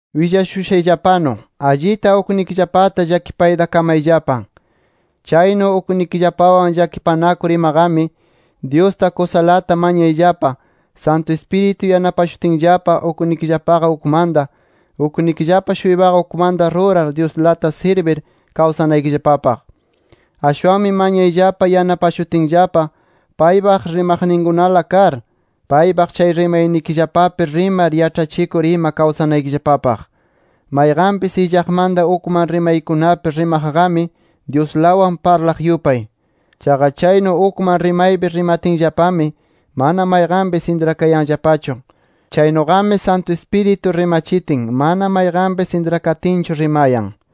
Willashushayllapanu, allita uknikillapata llakipayta kamayllapa. Chaynu uknikillapawan llakipanakur imaqami, Dyusta kusalata mañayllapa Santu Ispiritu yanapashutinllapa uknikillapaqa ukmanta, uknikillapa-shuypaqa ukmanta rurar Dyuslata sirbir kawsanaykillapapaq. Ashwanmi mañayllapa yanapashutinllapa paypaq rimaqninkunalana kar, paypaq chay rimaynikillapallapi rimar yaĉhachikur ima kawsanaykillapapaq. Mayqanpis illaqmanta ukman rimaykunapi rimaqqami, Dyuslawan parlaq yupay. Chaqa chaynu ukman rimaypi rimatinllapami, mana mayqanpis intrakayanllapachu. Chaynuqami, Santu Ispiritu rimachitin mana mayqanpis intrakatinchu rimayan.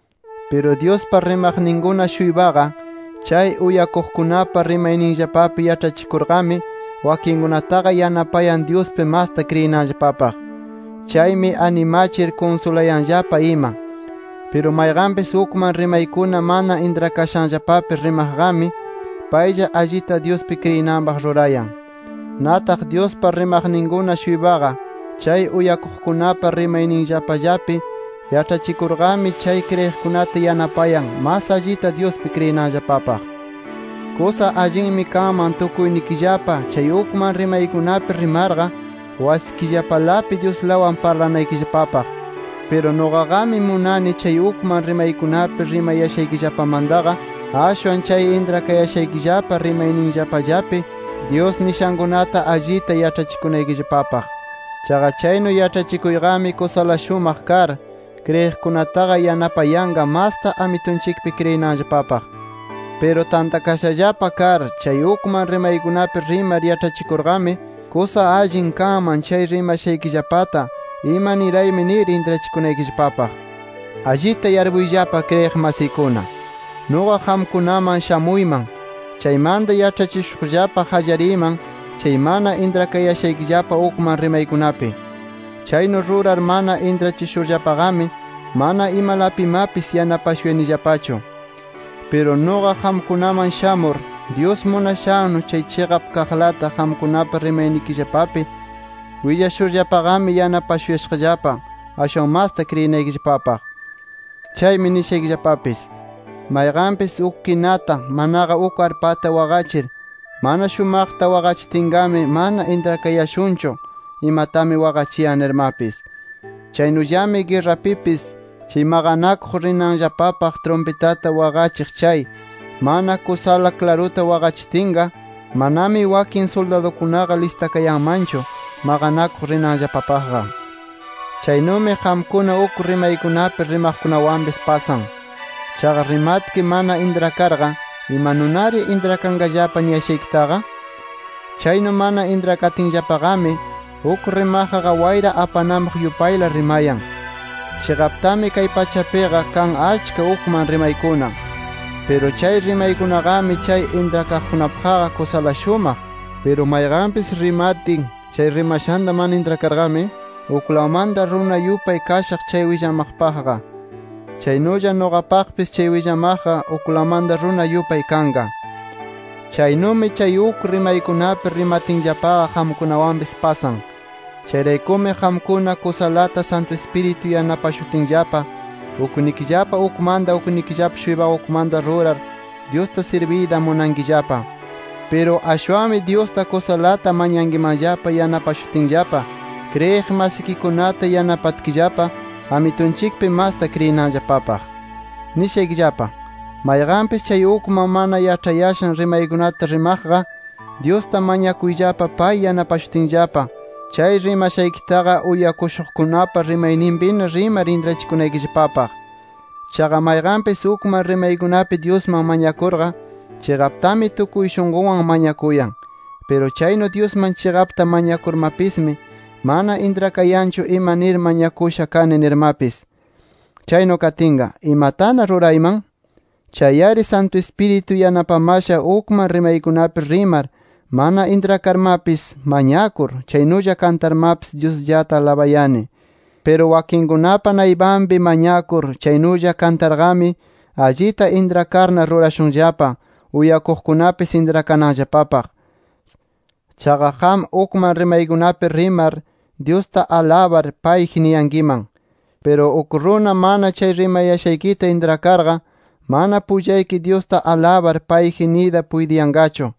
Piru Dyuspa rimaqninkuna-shuypaqa chay uyakuqkunapa rimayninllapallapi yaĉhachikurqami, wakinkunataqa yanapayan, Dyuspi masta kriyinanllapapaq. Chaymi animachir kunsulayanllapa ima. Piru mayqanpis ukman rimaykuna mana intrakashanllapapi rimaqqami, paylla allita Dyuspi kriyinanpaq rurayan. Nataq Dyuspa rimaqninkuna-shuypaqa chay uyakuqkunapa rimayninllapallapi yaĉhachikurqami, chay kriyiqkunata yanapayan, mas allita Dyuspi kriyinanllapapaq. Kusa allinmi kanman tukuynikillapa chay ukman rimaykunapi rimarqa, wasikillapalapi Dyuslawan parlanaykillapapaq. Piru nuqaqami munani chay ukman rimaykunapi rimayashaykillapamantaqa, ashwan chay intrakayashaykillapa rimayninllapallapi Dyus nishankunata allita yaĉhachikunaykillapapaq. Chaqa chaynu yaĉhachikuyqami kusala shumaq kar, kriyiqkunataqa yanapayanqa masta Amitunchikpi kriyinanllapapaq. Piru tantakashallapa kar chay ukman rimaykunapi rimar yaĉhachikurqami, kusa allin kanman chay rimashaykillapata ima niraymi nir intrachikunaykillapapaq. Allita yarpuyllapa kriyiq masiykuna. Nuqa qamkunaman shamuyman. Chaymanta yaĉhachishuqllapa qallariyman chay mana intrakayashaykillapa ukman rimaykunapi. Chaynu rurar mana intrachishurllapaqami mana imalapimapis yanapashuyanillapachu. Piru nuqa qamkunaman shamur, Dyus munashannu, chay chiqap kaqlata qamkunapa rimaynikillapallapi willashurllapaqami, yanapashuyashaqllapa ashwan masta kriyinaykillapapaq. Chaymi nishaykillapapis: Mayqanpis uk kinata, manaqa uk arpata waqachir, mana shumaqta waqachitinqami, mana intrakayashunchu, imatami waqachiyan nirmapis. Chaynullami guerrapipis, chay maqanakuq rinanllapapaq trumpitata waqachiq chay, mana kusala klaruta waqachitinqa, manami wakin suldadukunaqa listakayanmanchu maqanakuq rinanllapapaqqa. Chaynumi qamkuna uk rimaykunapi rimaqkunawanpis pasan. Chaqa rimatki mana intrakarqa, ¿imanunari intrakanqallapa niyashaykitaqa? Chaynu mana intrakatinllapaqami, uk rimaqqa wayra apananpaq yupayla rimayan. Chiqaptami kay pachapiqa, kan achka ukman rimaykuna. Piru chay rimaykunaqami, chay intrakaqkunapaqqa kusala shumaq. Piru mayqanpis rimatin, chay rimashanta mana intrakarqami, uklawmanta runa yupay kashaq chay willamaqpaqqa. Chaynulla nuqapaqpis chay willamaqqa uklawmanta runa yupay kanqa. Chaynumi chay uk rimaykunapi rimatinllapaqa, qamkunawanpis pasan. Chayraykumi qamkuna kusalata Santu Ispiritu yanapashutinllapa uknikillapa ukmanta, uknikillapa-shuypaqa ukmanta rurar, Dyusta sirbiyta munankillapa. Piru ashwanmi Dyusta kusalata mañankimanllapa yanapashutinllapa, kriyiq masikikunata yanapatkillapa Amitunchikpi masta kriyinanllapapaq. Nishaykillapa: Mayqanpis chay ukman mana yaĉhayashan rimaykunata rimaqqa, Dyusta mañakuyllapa pay yanapashutinllapa, chay rimashaykitaqa uyakushuqkunapa rimayninpina rimar intrachikunaykillapapaq. Chaqa mayqanpis ukman rimaykunapi Dyusman mañakurqa, chiqaptami tukuy shunqunwan mañakuyan. Piru chaynu Dyusman chiqapta mañakurmapismi, mana intrakayanchu ima nir mañakusha kani nirmapis. Chaynu katinqa, ¿imatana rurayman? Chay-ari Santu Ispiritu yanapamasha ukman rimaykunapi rimar mana intrakarmapis, mañakur, chaynulla kantarmapis Dyusllata alabayani. Piru wakinkunapa naypanpi mañakur, chaynulla kantarqami, allita intrakarna rurashunllapa, uyakuqkunapis intrakananllapapaq. Chaqa qam ukman rimaykunapi rimar Dyusta alabar, payji niyankiman. Piru uk runa mana chay rimayashaykita intrakarqa, mana pullayki Dyusta alabar, payji niyta puytiyanqachu.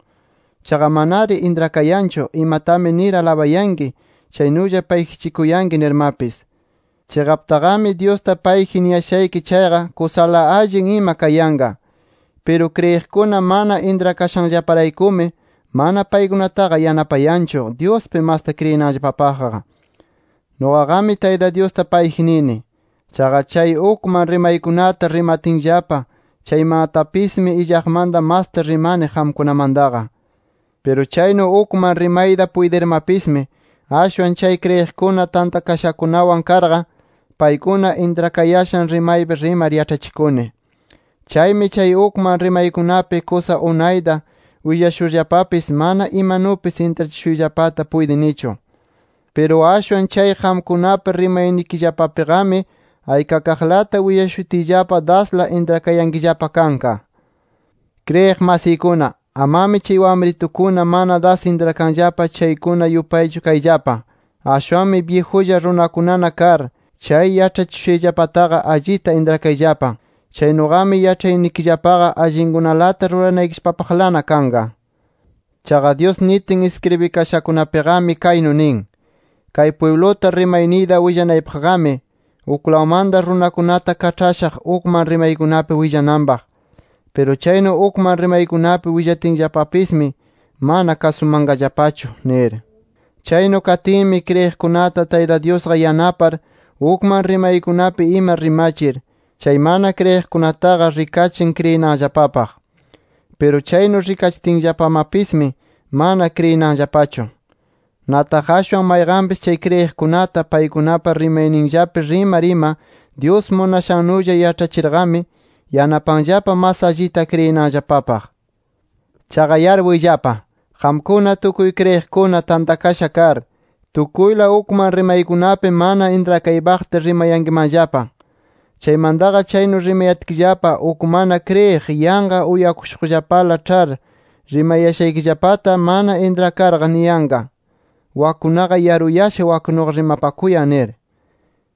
Chaqa manari intrakayanchu imatami nir alabayanki, chaynulla payjichikuyanki nirmapis. Chiqaptaqami Dyusta payji niyashayki chayqa kusala allin ima kayanqa. Piru kriyiqkuna mana intrakashanllaparaykumi, mana paykunataqa yanapayanchu, Dyuspi masta kriyinanllapapaqqa. Nuqaqami, Tayta Dyusta payji nini. Chaqa chay ukman rimaykunata rimankillapa chaymatapismi illaqmanta masta rimani qamkunamantaqa. Piru chaynu ukman rimayta puytirmapismi, ashwan chay kriyiqkuna tantakashakunawan karqa, paykuna intrakayashan rimaypi rimar yaĉhachikuni. Chaymi chay ukman rimaykunapi kusa unayta willashurllapapis mana imanupis intrachishuyllapata puytinichu. Piru ashwan chay qamkunapa rimaynikillapapiqami aykakaqlata willashutiyllapa dasla intrakayankillapa kanqa. Kriyiq masiykuna, amami chay wamritukuna mana das intrakanllapa chaykuna yupaychu kayllapa. Ashwanmi byijulla runakunana kar, chay yaĉhachishushayllapataqa allita intrakayllapa. Chaynuqami yaĉhaynikillapaqa allinkunalata ruranaykillapapaqlana kanqa. Chaqa Dyus nitin iskribikashakunapiqami, kaynu nin: “Kay pwibluta rimayniyta willananpaqmi, uklawmanta runakunata kaĉhashaq ukman rimaykunapi willananpaq. Piru chaynu ukman rimaykunapi willatinllapamapismi mana kasumanqallapachu” nir. Chaynu katinmi, kriyiqkunata Tayta Dyusqa yanapar ukman rimaykunapi ima rimachir, chay mana kriyiqkunataqa rikachin kriyinanllapapaq. Piru chaynu rikachitinllapamapismi, mana kriyinanllapachu. Nataq ashwan mayqanpis chay kriyiqkunata paykunapa rimayninllapi rimar ima Dyus munashannulla yaĉhachirqami, yanapanllapa mas allita kriyinanllapapaq. Chaqa yarpuyllapa: Qamkuna tukuy kriyiqkuna tantakasha kar, tukuyla ukman rimaykunapi mana intrakaypaqta rimayankimanllapa. Chaymantaqa chaynu rimayatkillapa, uk mana kriyiq yanqa uyakushuqllapala ĉhar, rimayashaykillapata mana intrakarqa niyanqa: Wakkunaqa yaruyasha waknuqa rimapakuyan nir.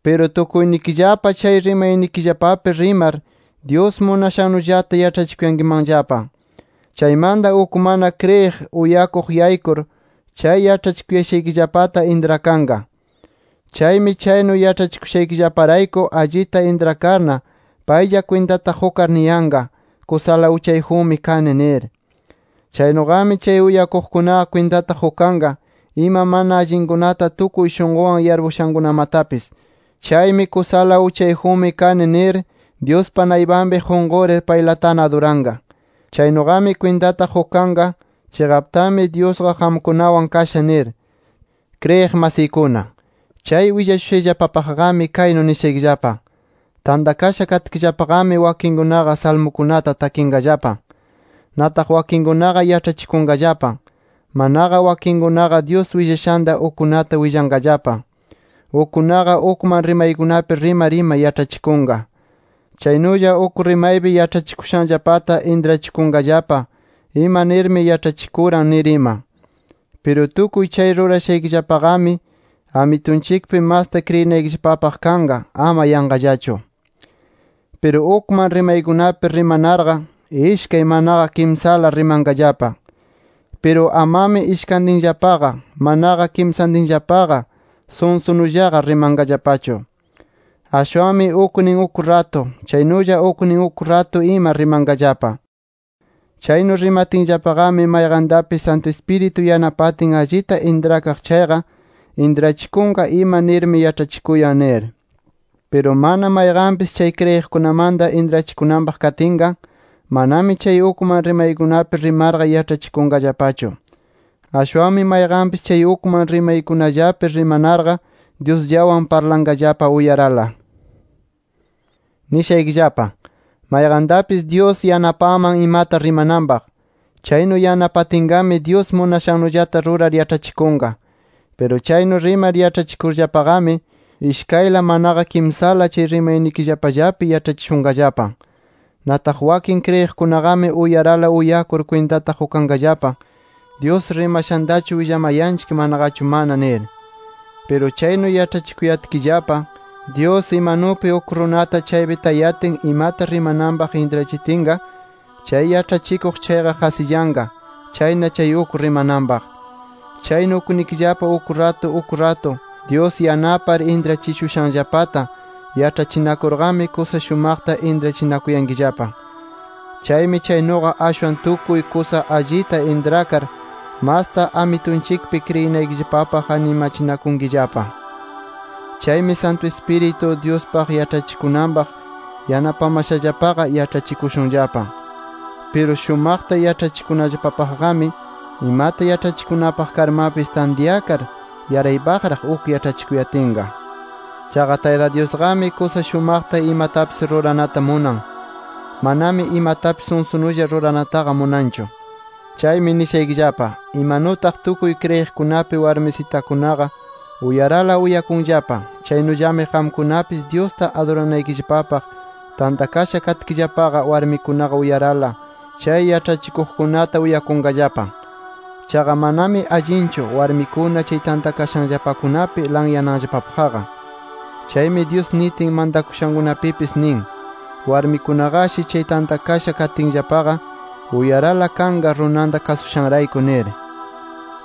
Piru tukuynikillapa chay rimaynikillapapi rimar Dyus munashannullata yaĉhachikuyankimanllapa. Chaymanta uk mana kriyiq uyakuq yaykur, chay yaĉhachikuyashaykillapata intrakanqa. Chaymi chaynu yaĉhachikushaykillaparayku allita intrakarqa, paylla kwintata qukar niyanqa: Kusala uchayjunmi kani nir. Chaynuqami chay uyakuqkunaqa kwintata qukanqa ima mana allinkunata tukuy shunqunwan yarpushankunamatapis. Chaymi kusala uchayjunmi kani nir, Dyuspa naypanpi qunqurir paylatana aduranqa. Chaynuqami kwintata qukanqa chiqaptami Dyusqa qamkunawan kasha nir. Kriyiq masiykuna, chay willashushayllapapaqqami kaynu nishaykillapa: Tantakasha katkillapaqami, wakinkunaqa salmukunata takinqallapa. Nataq wakinkunaqa yaĉhachikunqallapa, manaqa wakinkunaqa Dyus willashanta ukkunata willanqallapa. Ukkunaqa ukman rimaykunapi rimar ima yaĉhachikunqa. Chaynulla uk rimaypi yaĉhachikushanllapata intrachikunqallapa ima nirmi yaĉhachikuran nir ima. Piru tukuy chay rurashaykillapaqami Amitunchikpi masta kriyinaykillapapaq kanqa, ama yanqallachu. Piru ukman rimaykunapi rimanarqa, ishkay, manaqa kimsala rimanqallapa. Piru amami ishkantinllapa, manaqa kimsallapaqa sunsunullaqa rimanqallapachu. Ashwanmi uknin uk ratu, chaynulla uknin uk ratu ima rimanqallapa. Chaynu rimatinllapaqami, mayqantapis Santu Ispiritu yanapatin allita intrakaq chayqa, intrachikunqa ima nirmi yaĉhachikusha nir. Piru mana mayqanpis, chay kriyiqkunamanta intrachikunanpaq katinqa, amami chay ukman rimaykunapi rimarqa yaĉhachikunqallapachu. Ashwanmi mayqanpis chay ukman rimaykunallapi rimanarqa, Dyusllawan parlanqallapa uyarala. Nishaykillapa: Mayqantapis Dyus yanapanman imata rimananpaq. Chaynu yanapatinqami, Dyus munashannullata rurar yaĉhachikunqa. Piru chaynu rimar yaĉhachikunarllapaqami, ishkayla manaqa kimsala chay rimaynikillapallapi yaĉhachishunqallapa. Nataq wakin kriyiqkunaqami uyarala uyakur kwintata qukanqallapa, Dyus rimashantachu willamayanchik manaqachu mana nir. Piru chaynu yaĉhachikuyatkillapa, Dyus imanupi uk runata chaypi tayatin imata rimananpaq intrachitinqa, chay yaĉhachikuq chayqa qasillanqa. Chayna chay uk rimananpaq. Chaynu uknikillapa uk ratu uk ratu, Dyus yanapar intrachishushanllapata yaĉhachinakurqami, kusa shumaqta intrachinakuyankillapa. Chaymi chaynuqa ashwan tukuy kusa allita intrakar masta Amitunchikpi kriyinaykillapapaq animachinakunkillapa. Chaymi Santu Ispiritu, Dyuspaq yaĉhachikunapaq yanapamashallapaqa yaĉhachikushunllapa. Piru shumaqta yaĉhachikunallapapaqqami, imata yaĉhachikunapaq karmapis, tantyakar yaraypaqraq uk yaĉhachikuyatinqa. Chaqa Tayta Dyusqami kusa shumaqta imatapis ruranata munan, manami imatapis sunsunulla ruranataqa munanchu. Chaymi nishaykillapa: Imanutaq tukuy kriyiqkunapi warmisitakunaqa uyarala uyakunllapa, chaynullami qamkunapis Dyusta aduranaykillapapaq tantakasha katkillapaqa, warmikunaqa uyarala chay yaĉhachikuqkunata uyakunqallapa. Chaqa manami allinchu warmikuna chay tantakashaykillapakunapi laqyananllapapaqqa. Chaymi Dyus nitin mantakushankunapipis nin, warmikunaqashi chay tantakasha katinllapaqa, uyarala kanqa runanta kasushanrayku nir.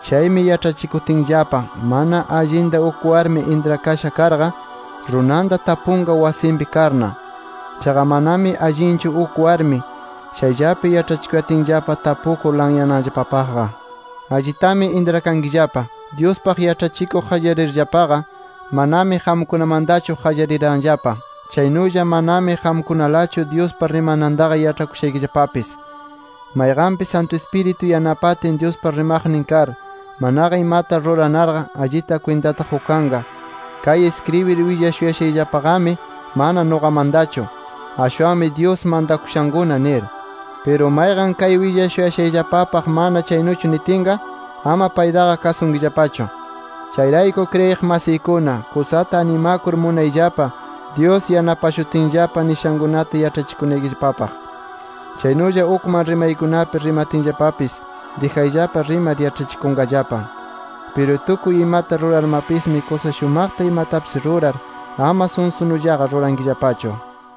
Chaymi yaĉhachikutinllapa mana allita uk warmi intrakasha karqa, runanta tapunqa wasinpi karna. Chaqa manami allinchu uk warmi chayllapi yaĉhachikuyatinllapa tapukur laqyananllapapaqqa. Allitami intrakankillapa, Dyuspaq yaĉhachikuq qallarirllapaqa, manami qamkunamantachu qallariranllapa. Chaynulla manami qamkunalachu Dyuspa rimanantaqa yaĉhakushaykillapapis. Mayqanpis Santu Ispiritu yanapatin Dyuspa rimaqnin kar, manaqa imata ruranarqa, allita kwintata qukanqa, kay iskribir willashuyashayllapaqami mana nuqamantachu, ashwanmi Dyus mantakushankuna nir. Piru mayqan kay willashuyashayllapapaq mana chaynuchu nitinqa, ama paytaqa kasunkillapachu. Chayrayku kriyiq masiykuna, kusata animakur munayllapa Dyus yanapashutinllapa nishankunata yaĉhachikunaykillapapaq. Chaynulla ukman rimaykunapi rimatinllapapis, dijayllapa rimar yaĉhachikunqallapa. Piru tukuy imata rurarmapismi kusa shumaqta imatapis rurar, ama sunsunullaqa rurankillapachu.